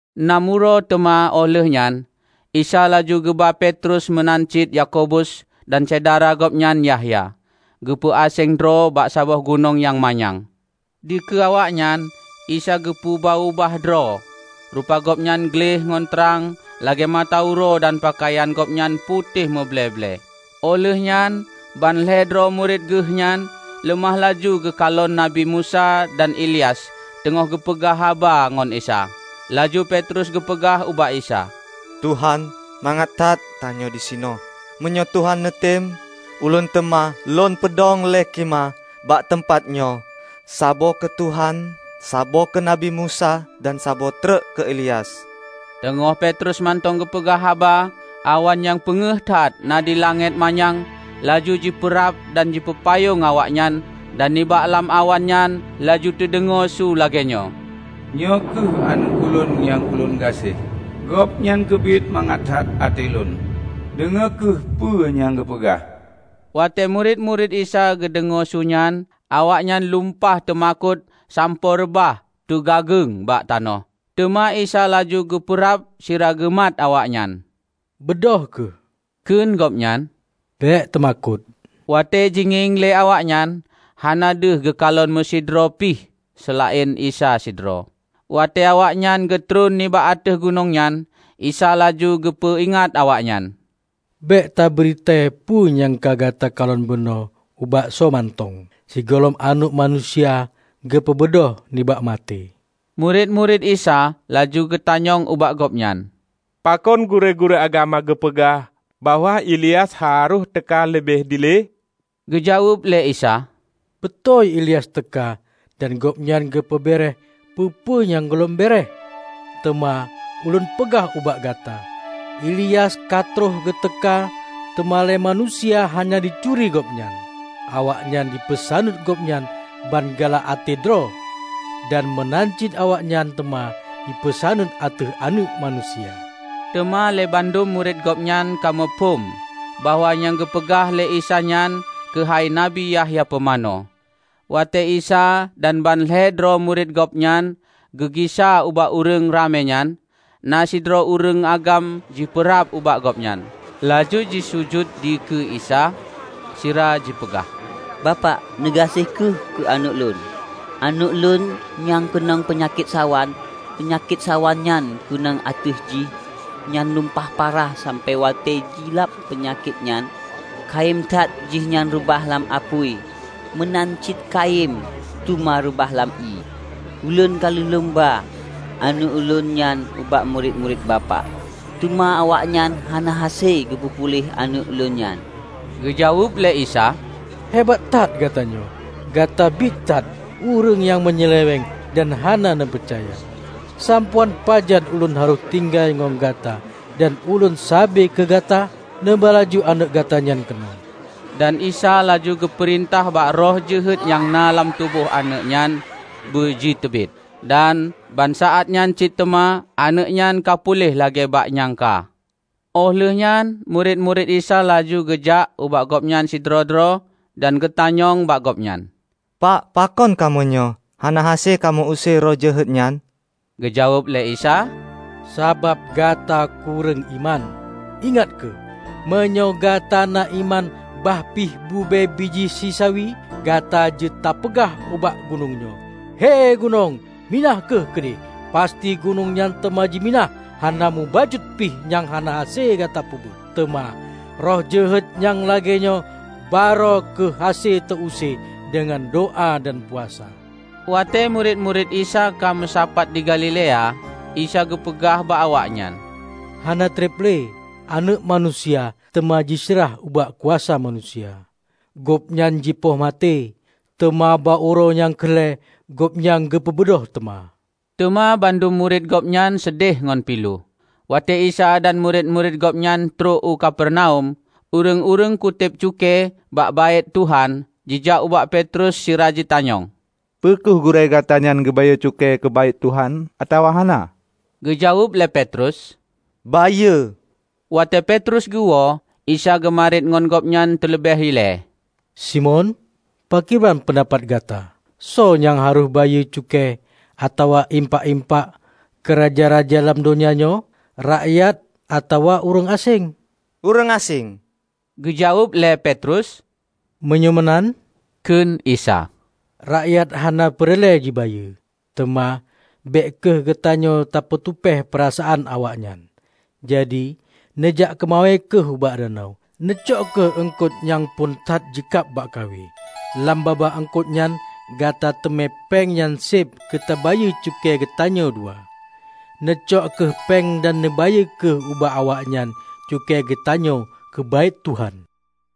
Nam uroe teuma óh lheueh nyan Isa laju geuba Petrus meunan cit Yakobus dan syedara gobnyan Yahya, geupeu-aséng droe bak saboh gunong nyang manyang. Dikeue awaknyan, Isa geupeu-ubah droe: Rupa Gobnyan gleh ngon trang lagée mata uroe dan peukayan Gobnyan putéh muble-ble. Óh lheueh nyan ban lhée droe murit Geuh nyan leumah laju geukalon Nabi Musa dan Ilyas teungoh geupeugah haba ngon Isa. Laju Petrus geupeugah ubak Isa, "Tuhan, mangat that tanyoe disinoe. Meunyoe Tuhan neutem, ulôn teuma lôn peudong lhée khimah bak teumpat nyoe: saboh keu Tuhan, saboh keu Nabi Musa dan saboh treuk keu Ilyas." Teungoh Petrus mantong geupeugah haba, awan nyang peungéh that na di langét manyang laju jipeurab dan jipeupayong awaknyan dan nibak lam awan nyan laju teudeungoe su lagée nyoe, "Nyoe kheueh Aneuëk Ulôn nyang Ulôn gaséh. Gobnyan keubiet mangat that até Lôn. Deungoe kheueh peue nyang Geupeugah!" Watée murit-murit Isa geudeungoe su nyan, awaknyan lumpah teumakot sampoe reubah teugageueng bak tanoh. Teuma Isa laju geupeurab sira geumat awaknyan. "Beudôh kheueh," kheun Gobnyan, "Bék teumakot!" Watée jingieng lé awaknyan, hana deuh geukalon meusidroe pih, seulaén Isa sidroe. Watée awaknyan geutron nibak ateueh gunong nyan, Isa laju geupeu-ingat awaknyan, "Bék tabri tée peue nyang ka gata kalon bunoe ubak soe mantong, sigohlom Aneuëk Manusia geupeubeudôh nibak maté." Murit-murit Isa laju geutanyong ubak Gobnyan, "Pakon gurée-gurée agama geupeugah bahwa Ilyas harôh teuka leubeh dilée?" Geujaweueb lé Isa, "Beutôi Ilyas teuka dan gobnyan geupeu béeréeh peue-peue nyang gohlom béeréeh. Teuma Ulôn peugah ubak gata, Ilyas ka troh geuteuka, teuma lé manusia hana jituri gobnyan; awaknyan jipeusaneut gobnyan ban galak até droe. Dan meunan cit awaknyan teuma jipeusaneut ateueh Aneuëk Manusia." Teuma lé bandum murit Gobnyan ka muphom bahwa nyang geupeugah lé Isa nyan keuhai Nabi Yahya Pumanö. Watée Isa dan ban lhée droe murit Gobnyan geugisa ubak ureuëng ramé nyan, na sidroe ureuëng agam jipeurab ubak Gobnyan, laju jisujut dikeue Isa, sira jipeugah, "Bapak, neugaséh kheueh keu aneuëk lôn. Aneuëk ulôn nyan keunong peunyakét sawan. Peunyakét sawan nyang keunong ateueh jih nyan lumpah parah sampoe watée jilab peunyakét nyan kayém that jihnyan reubah lam apui meunan cit kayém teuma reubah lam ié. Ulôn ka lheueh lôn ba aneuëk ulôn nyan ubak murit-murit Bapak, teuma awaknyan hana hase geupeu puléh aneuëk ulôn nyan." Geujaweueb lé Isa, "Hebat that gata nyoe! Gata biet that ureuëng nyang meunyeuleweng dan hana neupeucaya. Sampoe án pajan Ulôn harôh tinggai ngon gata dan Ulôn saba keu gata? Neuba laju aneuëk gata nyan keunoe!" Dan Isa laju geupeurintah bak roh jeuhet nyang na lam tuboh aneuëk nyan beu jiteubiet. Dan bak saát nyan cit teuma aneuëk nyan ka puléh lagée bak nyang ka. Óh lheueh nyan murit-murit Isa laju geujak ubak Gobnyan sidroe-droe dan geutanyong bak Gobnyan, "Pak, pakon kamoe nyoe hana hase kamoe use roh jeuhet nyan?" Geujaweueb lé Isa, "Sabab gata kureueng iman. Ingat kheueh! Meunyoe gata na iman bah pih bube bijéh sisawi, gata jeuet tapeugah ubak gunong nyoe, 'He gunong, minah kheueh keudeh!' Pasti gunong nyan teuma jiminah. Hana mubacut pih nyang hana hase gata peubuet! Teuma roh jeuhet nyang lagée nyoe, barô kheueh hase teu-use deungon doá dan puasa." Watée murit-murit Isa ka meusapat di Galilea, Isa geupeugah bak awaknyan, "Hana treb le, Aneuëk Manusia teuma jiseurah ubak kuasa manusia. Gobnyan jipoh maté, teuma bak uroe nyang keu lhée Gobnyan geupeubeudôh teuma." Teuma bandum murit Gobnyan seudeh ngon pilu. Watée Isa dan murit-murit Gobnyan trok u Kapernaum, ureuëng-ureuëng kutéb cukée bak Baét Tuhan jijak ubak Petrus sira jitanyong, "Peu kheueh Gurée gata nyan geubayeue cukée keu Baét Tuhan atawa hana?" Geujaweueb lé Petrus, "Bayeue!" Watée Petrus geuwoe, Isa geumariet ngon gobnyan teuleubeh ilée, "Simon, pakriban peundapat gata? Soe nyang harôh bayeue cukée atawa impak-impak keu raja-raja lam donya nyoe? Rakyat atawa ureuëng aséng?" "Ureuëng aséng," geujaweueb lé Petrus. "Meunyoe meunan," kheun Isa, "rakyat hana peureulée jibayeue. Teuma bék kheueh geutanyoe ta peutupéh peurasaan awaknyan. Jadi, neujak keumawe kheueh ubak danau. Neucok kheueh eungkot nyang phon that jikab bak kawe. Lam babah eungkot nyan gata teumé péng nyang seb keu tabayeue cukée geutanyoe dua. Neucok kheueh péng dan neubayeue kheueh ubak awaknyan cukée geutanyoe keu Baét Tuhan."